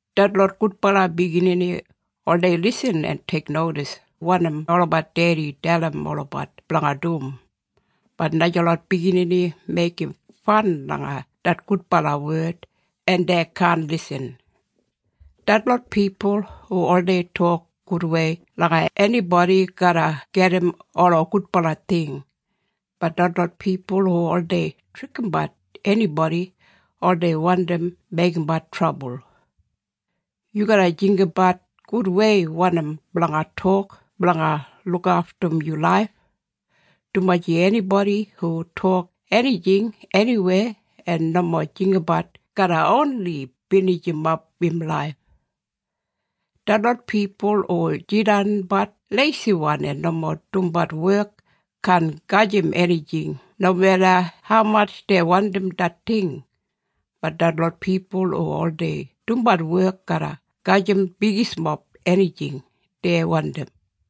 Detlot gudbala biginini oldei lisin en teiknodis wanim olabat dedi dalim olabat blanga dum, bat najalot biginini meigim fan langa det gudbala wed en dei kaan lisin. Detlot pipul hu oldei tok gudwei langa enibodi garra gedim ola gudbala ting, bat detlot pipul hu oldei trikimbat enibodi oldei wandim meigimbat trabul. Yu garra jinggabat gudwei wanim blanga tok blanga lukaftum yu laif, dumaji enibodi hu tok enijing eniweya en nomo jinggabat garra oni binijimap im laif. Detlot pipul hu jidanbat leisiwan en nomo dumbat wek kaan gajim enijing nomeda haumatj dei wandim det ting, bat detlot pipul hu oldei dumbat wek garra gajim bigismob enijing dei wandim.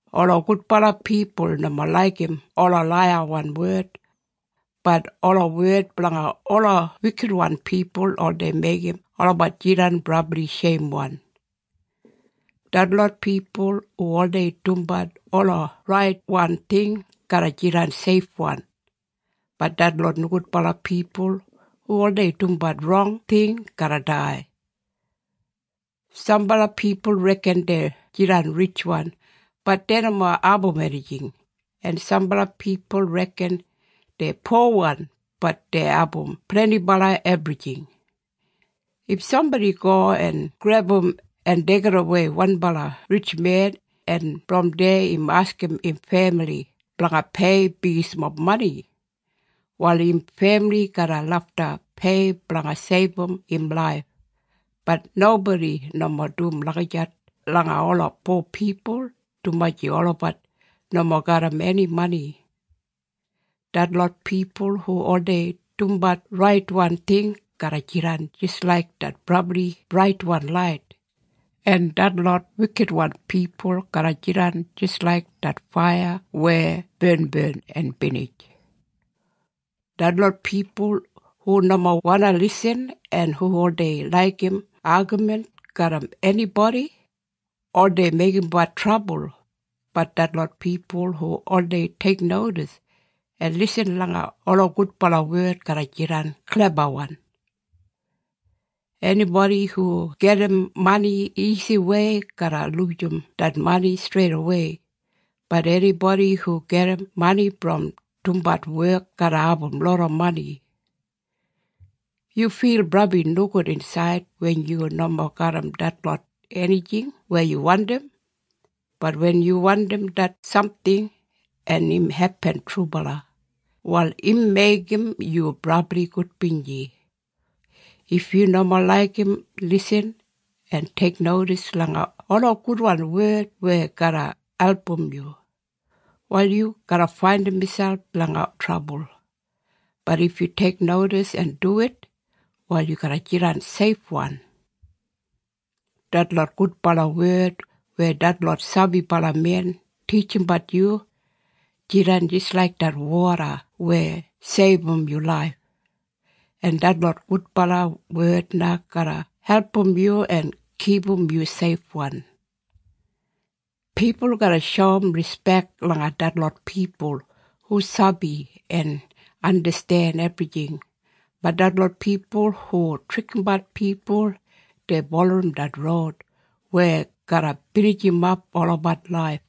Ola gudbala pipul nomo laigim ola laiyawan wed, bat ola wed blanga ola wikitwan pipul oldei meigim olabat jidan brabli sheimwan. Detlot pipul hu oldei dumbat ola raitwan ting garra jidan seifwan, bat detlot nogudbala pipul hu oldei dumbat rong ting garra dai. Sambala pipul reken dei jidan ritjwan, bat dei nomo abum enijing, en sambala pipul reken dei powan, bat dei abum blendibala ebrijing. If sambodi go en grebum en deigidawei wanbala ritjmen, en brom deya im askim im femili blanga pei bigismob mani, wal im femili garra lafta pei blanga seibum im laif, bat nobodi nomo dum lagijat langa ola po pipul dumaji olabat nomo garram eni mani. Detlot pipul hu oldei dumbat raitwan ting garra jidan jis laik det brabli braitwan lait, en detlot wikitwan pipul garra jidan jis laik det faiya weya barnbarn en binij. Detlot pipul hu nomo wandi lisin en hu oldei laigim agamin garram enibodi, oldei meigimbat trabul, bat detlot pipul hu oldei teiknodis en lisin langa ola gudbala wed garra jidan klebawan. Enibodi hu gedim mani isiwei garra lujim det mani streidawei, bat enibodi hu gedim mani brom dumbat wek garra abum loda mani. Yu fil brabli nogud insaid wen yu nomo garram detlot enijing weya yu wandim, bat wen yu wandim det samting en im hepin trubala, wal im meigim yu brabli gudbinji. If yu nomo laigim lisin en teiknodis langa ola gudwan wed weya garra album yu, wal yu garra faindim miselp langa trabul, bat if yu teiknodis en duwit, wal yu garra jidan seifwan. Detlot gudbala wed weya detlot sabibalamen titjimbat yu jidan jis laik det woda weya seibum yu laif, en detlot gudbala wed na garra album yu en kipum yu seifwan. Pipul garra shoum rispek langa detlot pipul hu sabi en andasten ebrijing, bat detlot pipul hu trikimbat pipul dei bulurrum det roud weya garra binijimap olabat laif.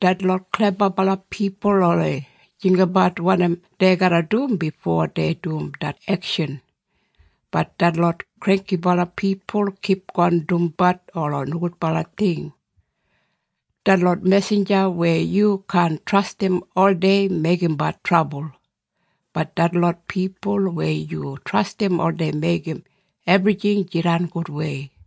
Detlot klebabala pipul oldei jinggabat wanim dei garra dum bifo dei dum det ekshan, bat detlot granggibala pipul kipgon dumbat ola nogudbala ting. Detlot mesinja weya yu kaan trastim oldei meigimbat trabul, bat detlot pipul weya yu trastim oldei meigim ebrijing jidan gudwei.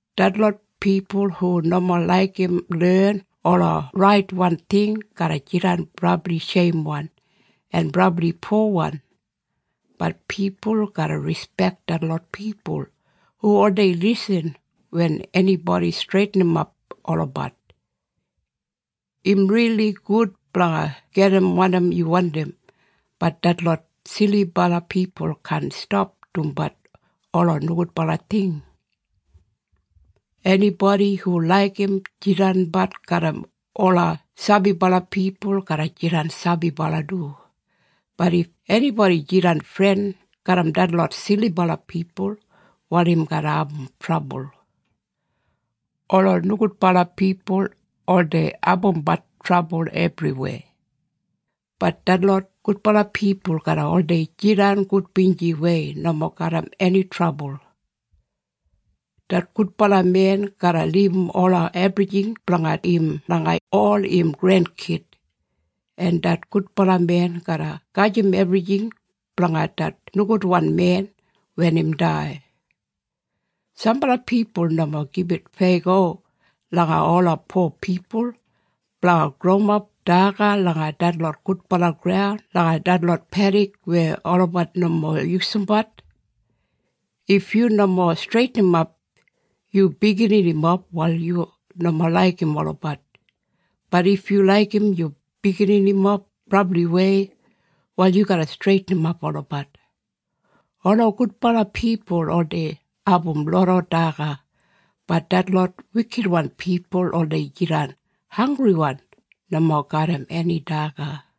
Detlot pipul hu nomo laigim len ola raitwan ting garra jidan brabli sheimwan en brabli powan, bat pipul garra rispek detlot pipul hu oldei lisin wen enibodi streitinimap olabat. Im rili gud blanga gedim wanim yu wandim, bat detlot silibala pipul kaan stap dumbat ola nogudbala ting. Enibodi hu laigim jidanbat garram ola sabibala pipul garra jidan sabibala du, bat if enibodi jidan fren garram detlot silibala pipul, wal im garra abum trabul. Ola nogudbala pipul oldei abumbat trabul ebriweya, bat detlot gudbala pipul garra oldei jidan gudbinjiwei nomo garram eni trabul. Det gudbala men garra libum ola ebrijing blanga im langa ol im grenkid, en det gudbala men garra gajim ebrijing blanga det nogudwan men wen im dai. Sambala pipul nomo gibit feyago langa ola po pipul blanga growimap daga langa detlot gudbala graun langa detlot pedik weya olabat nomo yusumbat. If yu nomo streitinimap yu bigininimob wal yu nomo laigim olabat, bat if yu laigim yu bigininimob brabliwei wal yu garra streitinimap olabat. Ola gudbala pipul oldei abum loda daga, bat detlot wikitwan pipul oldei jidan hanggriwan, nomo garram eni daga.